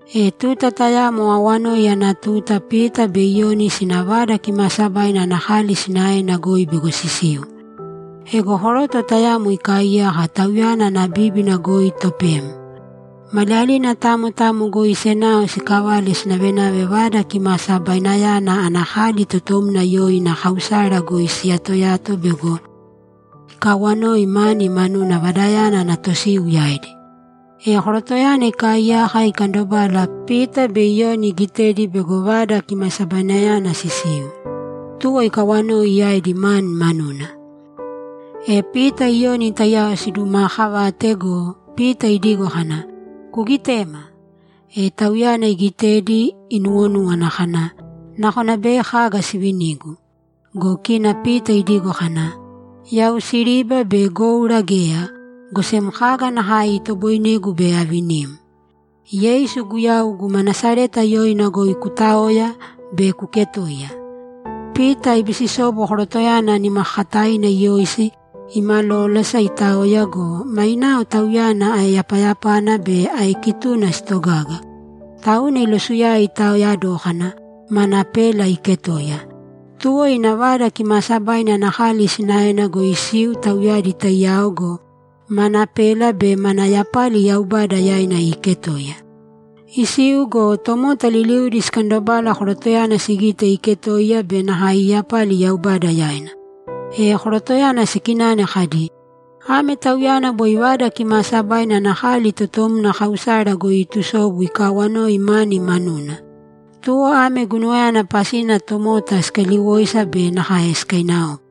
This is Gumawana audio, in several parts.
E tuta tayamo awanoi ana tuta Pita be Iyoni sina Vada Kimaasabaina ana kali sinaena goi bego sisiu. Ego koroto tayamo ikaaiyaka, tauyana ana bíbina goi topem. Maliyalina tamo tamo goi senao sikavale sinavenave Vada Kimasabainayana ana kali totomna yoina Kausara goi siyatoyato bego ikawanoi mani manuna Vadayana ana tosiu yaidi. E korotoyana ikaaiyaka ikandobala, Pita be Iyoni iigitedi bego Vada Kimasabainayana sisiu, tuwo ikawanoi yaidi mani manuna. E Pita Iyoni taiyao sidumaakavate go, Pita idigo kana, ‘Kugitēma!’ E tauyana igitedi inuwonúwana kana, ‘Nakona bei kaga sivinigu.’ Go kina Pita idigo kana, ‘Yau siriba be goura geya, go sem kaga nakae itoboinegu bei avinim. Yeisu Guyau guma Nasareta yoina goi kutāoya be kuketōiya!’ Pita ibisisobu korotoyana nimakakataina iyoisi, imalolasa itaoya go, mainao tauyana aeyapayapana be aekituna sitogaga. Tauna ilosuyae itaoya dókana, mana pela iiketoiya. Tuwo ina Vada Kimaasabaina ana kali sinaena goi isiu tauyadi taiyao go, mana pela be mana yapali Yaubada yaina iiketoiya. Isiu go, tomota liliudi sikandobala korotoyana sigite iiketoiya be nakae iiyapali Yaubada yaina. E korotoyana sikinane kadi, ‘Ame tauyana boi Vada Kimaasabaina ana kali totomna Kausara goi iitusobu ikaawanoi mani manuna!’ Tuwo ame guinuwayana pasina tomota sikaliwoisa be nakae sikainaopa.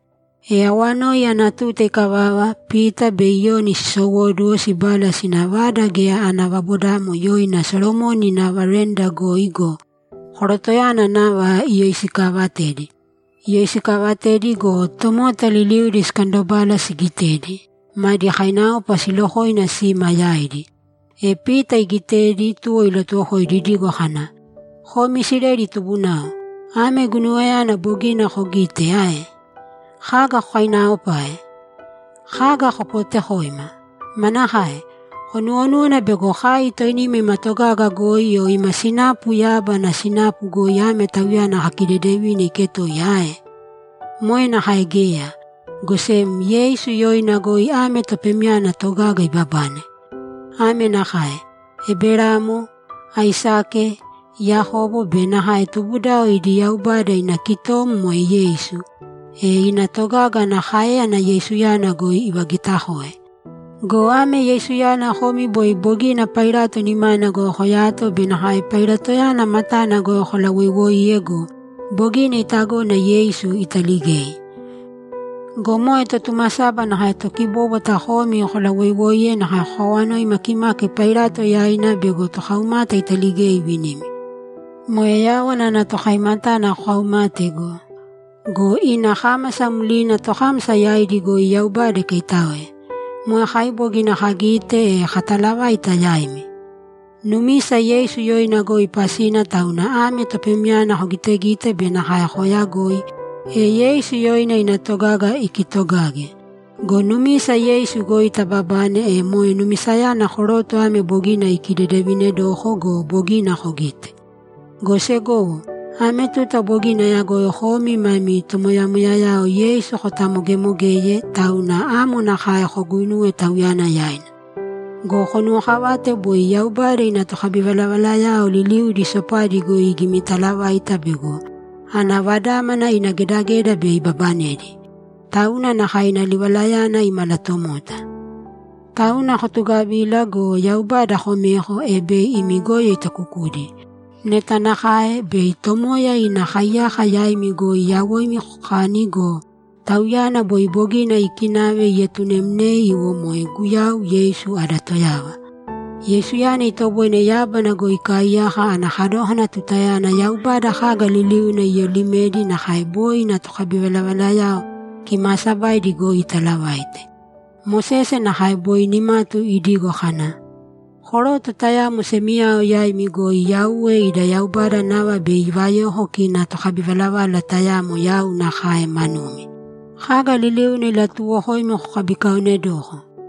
E awanoi ana tuta ikavava, Pita be Iyoni sisowóduwo, sibala sina vada geya ana vabodamo yoina Solomoni ina veranda goi go, korotoyana nava iyoisikaavatedi. Iyoisikaavatedi go, tomota liliudi sikandobala sigitedi, madi kainaopa silokoina sima yaidi. E Pita igitedi, tuwo ilatuwokoidi idigo kana, ‘Komi Isileli tubunao, ame guinuwayana bogina kogite ae? Kaga kokainaopae? Kaga kopootekoima? Manakae? Konuwonúwana bego kai toinima ima togaga goi o ima sinapu yábana sinapuna goi ame tauyana kakidedevine iketoiya ae? Moe nakae geya, go sem Yeisu yoina goi ame topemyana togaga ibabane. Ame nakae: Eberamo, Aisake, Yakobo be nakae tubudao idi Yaubada ina kitom moe Yeisu. E ina togaga ana káeyana Yeisuyana goi ivagitakoe. Go ame Yeisuyana komi boi bogina Pailato nimana goi koyato be nakae Pailatoyana matana goi kolawoiwoiye go, bogina itagona Yeisu italigei! Go moe Totumasaba nakae Tokibóbwata komi kolawoiwoiye nakae kokawanoi makimaki Pailato yaina bego tokaumata italigei ivinimi. Moe Yáwana ana Tokaimatana kokaumate go! Go ina kámasa mlina tokámasa yaidi goi Yaubada ikaitáoe! Moe kai bogina kagite, e kataalavaite yaimi. Numisa Yeisu yoina goi pasina, tauna ame topemyana kogitegite be nakae kooyagoi, e Yeisu yoina ina togaga ikitogage. Go numisa Yeisu goi tababane, e moe numisayana koroto ame bogina ikidedevinedoko go, bogina kogite. Go segowo, ame tuta bogina ayagoi komi mami tomoyamoyayao Yeisu kotamogemogeye, tauna amo nakae koguinuwe Tauyana yaina. Go konuwokavāte boi Yaubada ina tokabivalavalayao liliudi sopadi goi igimitalavaita bego ana Vadámana ina gedageda bei ibabanedi. Tauna nakae ina livalayana imalatomota. Tauna kotugavīla go, Yaubada komēko, e bei imi goyo itakukudi. Neta nakae, bei Tomoya ina kaiyaka yaimi goi yawoimi kokani go, Tauyana boi bogina iikinave ietunemnei iwo moe Guyau Yeisu ada Toyava. Yeisuyana itoboine yábana goi ikaaiyaka ana kadókana tutayana Yaubada kaga liliuna iyolimedi nakae boi ina tokabivalavalayao kimaasabaidi goi italavaite. Mosese nakae boi nimatu idigo kana, “Koroto tayamo semiyao yaimi goi Yauwe ida Yaubada nava bei ivayoko kina tokabivalavala tayamo yau nakae manumi. Kaga liliuna ilatuuwokoimi kokabikaonedōko.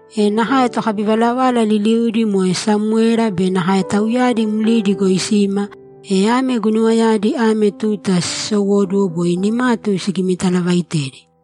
E nakae tokabivalavala liliudi moe Samwera be nakae tauyadi mlina goi sima, e ame guinuwayadi ame tuta siisowóduwo boi nimatu sigimitalavaitedi.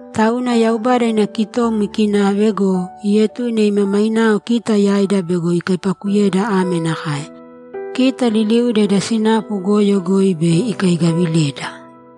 Tauna Yaubada ina kitom ikinave go, ietune ima mainao kita yaida bego ikaipakuyeda ame nakae: Kita liliuda ida sinapu goyo goi bei ikaigavileda.’